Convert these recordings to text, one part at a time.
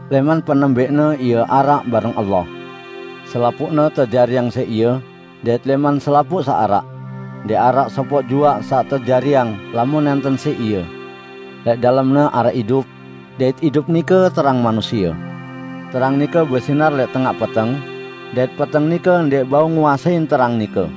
Lẽman penembẽqne Ie araq bareng Allah. Selapuqne tejariang siq Ie, dait lẽman selapuq saq araq, ndẽq araq sopoq juaq saq tejariang, lamun nẽnten siq Ie. Lẽq dalem-Ne araq idup, dait idup nike terang manusie. Terang nike besinar lẽq tengaq peteng, dait peteng nike ndẽq bau nguasein terang nike.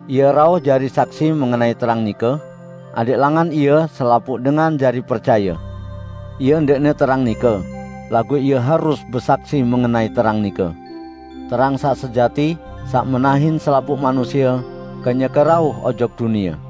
Ie rauh jari saksi mengenai terang nike, adẽq langan ie selapuq dengan jari percaye. Ie ndẽqne terang nike, laguq ie harus besaksi mengenai terang nike. Terang saq sejati, saq menahin selapuq manusie, kenyeke rauh ojok dunie.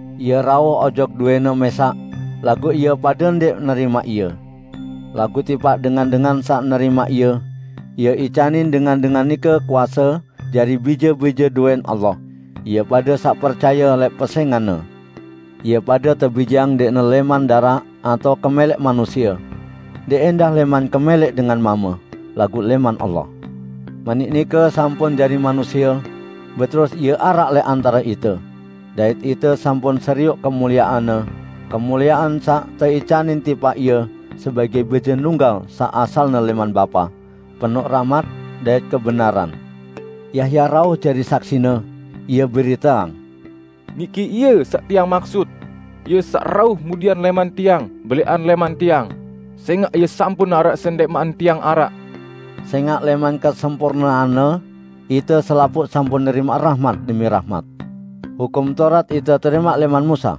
Ie rauh ojok dowẽ-Ne mẽsaq laguq ie pade ndẽq nerimaq Ie. Laguq tipaq dengan-dengan saq nerimaq Ie, Ie icanin dengan-dengan nike kuase jari bije-bije dowẽn Allah, ie pade saq percaye lẽq pesẽngan-Ne. Ie pade tebijeang ndẽqne lẽman daraq atao kemẽlẽq manusie, ndẽq ẽndah lẽman kemẽlẽq dengan mame, laguq lẽman Allah. Manik nike sampun jari manusie, beterus Ie araq lẽq antare ite, dait ite sampun serioq kemuliean-Ne, kemuliean saq teicanin tipaq Ie sebagẽ Bije Nunggal saq asalne lẽman Bapa, penoq rahmat dait kebenaran. Yahya rauh jari saksi-Ne, ie beriteang: "Niki Ie saq tiang maksut: Ie saq rauh mudian lẽman tiang belẽqan lẽman tiang, sẽngaq Ie sampun araq sendẽqman tiang araq." Sẽngaq lẽman kesempurnean-Ne, ite selapuq sampun nerimaq rahmat demi rahmat. Hukum Taurat ite terimaq lẽman Musa.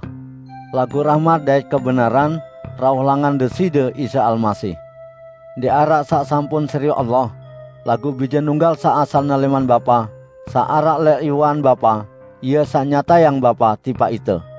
Laguq rahmat dait kebenaran rauh langan Deside Isa Almasih. Ndẽq araq saq sampun serioq Allah, laguq Bije Nunggal saq asalne lẽman Bapa, saq araq lẽq iwean Bapa. Ie saq nyatayang Bapa tipaq ite.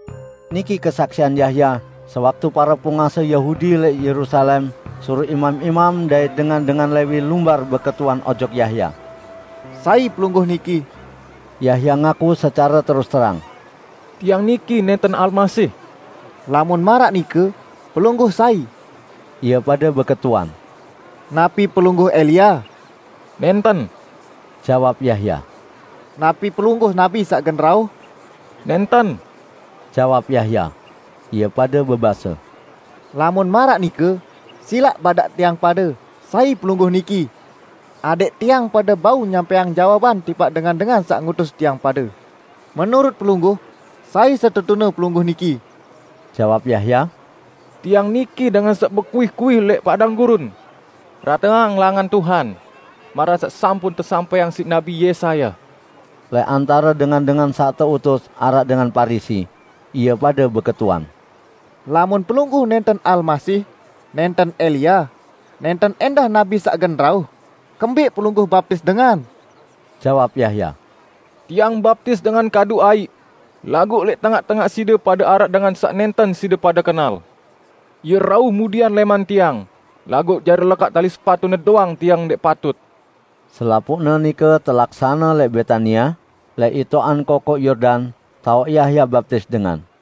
Niki kesaksian Yahya sewaktu pare penguase Yahudi lẽq Yerusalem suruq imam-imam dait dengan-dengan Lewi lumbar beketuan ojok Yahya, "Sai pelungguh niki?" Yahya ngaku secare terus-terang, "Tiang niki nẽnten Almasih." "Lamun maraq nike, pelungguh sai?" Ie pade beketuan. "Napi pelungguh Elia?" "Nẽnten," jawab Yahya. "Napi pelungguh nabi saq gen rauh?" "Nẽnten," jawab Yahya. Ie pade bebase, "Lamun maraq nike, silaq badaq tiang pade sai pelungguh niki?" Adẽq tiang pade bau nyampẽang jawaban tipaq dengan-dengan saq ngutus tiang pade. Menurut pelungguh sai setetune pelungguh niki?" Jawab Yahya, "Tiang niki dengan saq bekuih-kuih lẽq padang gurun, 'Rateang langan Tuhan.' Maraq saq sampun tesampẽang siq Nabi Yesaya." Lẽq antare dengan-dengan saq teutus araq dengan Parisi, ie pade beketuan, "Lamun pelungguh nẽnten Almasih, nẽnten Elia, nẽnten ẽndah nabi saq gen rauh, kembẽq pelungguh baptis dengan?" Jawab Yahya, "Tiang baptis dengan kadu aiq. Laguq lẽq tengaq-tengaq side pade araq Dengan saq nẽnten side pade kenal. Ie rauh mudian lẽman tiang, laguq jari lekaq tali sepatu-Ne doang tiang ndẽq patut." Selapuqne nike telaksane lẽq Betania, lẽq itoqan Kokoq Yordan taoq Yahya baptis dengan.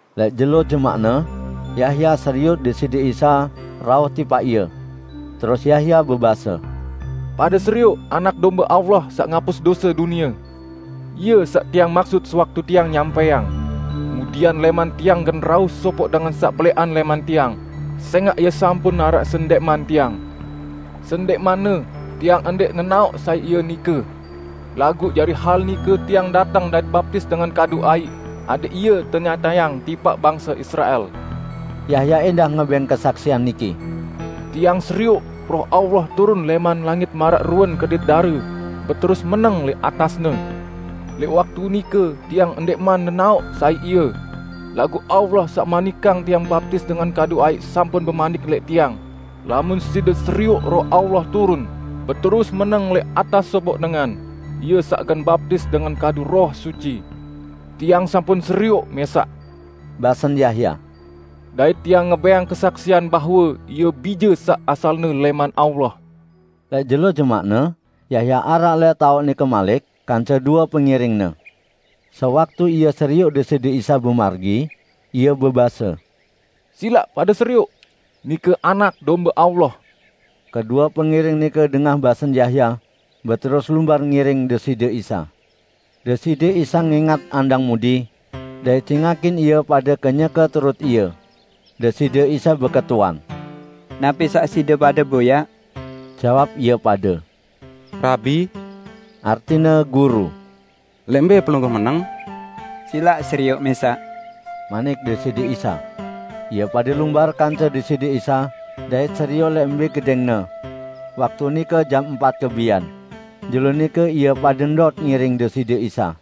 Lẽq jelo jemaqne, Yahya serioq Deside Isa rauh tipaq ie. Terus Yahya bebase, "Pade serioq Anak Dombe Allah saq ngapus dose dunie. Ie saq tiang maksut sewaktu tiang nyampẽang: Mudian lẽman tiang gen rauh sopoq dengan saq belẽqan lẽman tiang, sẽngaq Ie sampun araq sendẽqman tiang. Sendẽqmanne, tiang ndẽq nenaoq sai Ie nike. Laguq jari hal nike tiang dateng dait baptis dengan kadu aiq, adẽq Ie tenyatayang tipaq bangse Israel." Yahya ẽndah ngebẽng kesaksian niki, "Tiang serioq Roh Allah turun lẽman langit maraq ruen kedit dare, beterus meneng lẽq atas-Ne. Lẽq waktu nike tiang ndẽqman nenaoq sai Ie. Laguq Allah saq manikang tiang baptis dengan kadu aiq sampun bemanik lẽq tiang, 'Lamun side serioq Roh Allah turun, beterus meneng lẽq atas sopoq dengan, Ie saq gen baptis dengan kadu Roh Suci.' Tiang sampun serioq mẽsaq," basen Yahya, "dait tiang ngebẽng kesaksian bahwe Ie Bije saq asalne lẽman Allah." Lẽq jelo jemaqne Yahya araq lẽq taoq nike malik kance due pengiringne. Sewaktu ie serioq Deside Isa bemargi, ie bebase, "Silaq pade serioq! Nike Anak Dombe Allah." Kedue pengiring nike dengah basen Yahya, beterus lumbar ngiring Deside Isa. Deside Isa ngẽngat andang mudi, dait cingakin ie pade kenyeke turut Ie. Deside Isa beketuan, "Napi saq side pade boyaq?" Jawab ie pade, "Rabi (artine: Guru), lẽq mbẽ Pelungguh meneng?" "Silaq serioq mẽsaq," manik Deside Isa. Ie pade lumbar kance Deside Isa dait serioq lẽq mbẽ gedẽng-Ne. Waktu nike jam empat kebian. Jelo nike ie pade ndot ngiring Deside Isa.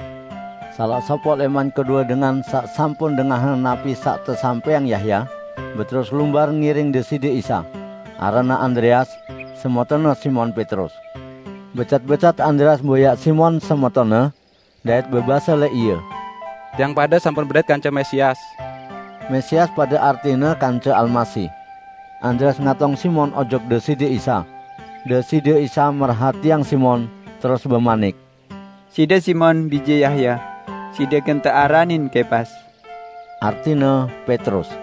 Salaq sopoq lẽman kedue dengan saq sampun dengahang napi saq tesampẽang Yahya, beterus lumbar ngiring Deside Isa, aranne Andreas, semetonne Simon Petrus. Becat-becat Andreas boyaq Simon, semetonne, dait bebase lẽq ie, "Tiang pade sampun bedait kance Mesias!" (Mesias pade artine kance Almasih.) Andreas ngatong Simon ojok Deside Isa. Deside Isa merhatiang Simon, terus bemanik, "Side Simon, bije Yahya. Side gen tearanin Kepas (artine: Petrus)."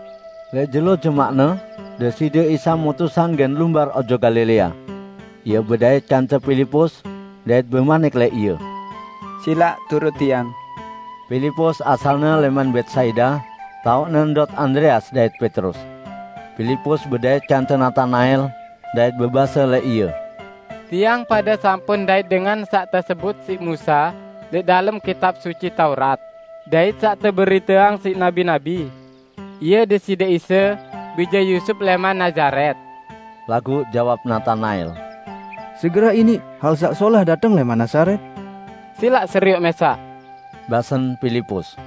Lẽq jelo jemaqne Deside Isa mutusang gen lumbar ojok Galilea. Ie bedait kance Pilipus, dait bemanik lẽq ie, "Silaq turut Tiang!" Pilipus asalne lẽman Betsaida, taoqne ndot Andreas dait Petrus. Pilipus bedait kance Natanael dait bebase lẽq ie, "Tiang pade sampun ndait Dengan saq tesebut siq Musa lẽq dalem Kitab Suci Taurat, dait saq teberiteang siq nabi-nabi. Ie Deside Isa bije Yusup lẽman Nazaret." Laguq jawab Natanael, "Segerah iniq hal saq solah dateng lẽman Nazaret?" "Silaq serioq mẽsaq!" basen Pilipus.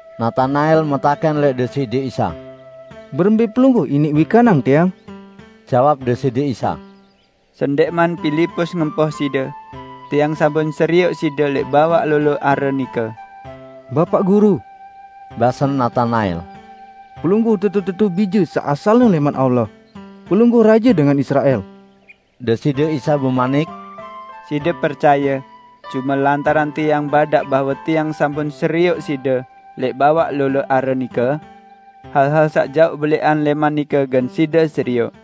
Natanael metakẽn lẽq Deside Isa, "Berembẽ Pelungguh iniq wikanang tiang?" Jawab Deside Isa, "Sendẽqman Pilipus ngempoh side, Tiang sampun serioq side lẽq bawaq lolo are nike." "Bapaq Guru," basen Natanael, "Pelungguh tetu-tetu Bije saq asalne lẽman Allah! Pelungguh Raje dengan Israel!" Deside Isa bemanik, "Side percaye, cume lantaran Tiang badaq bahwe Tiang sampun serioq side lẽq bawaq lolo are nike? Hal-hal saq jaoq belẽqan lẽman nike gen side serioq!"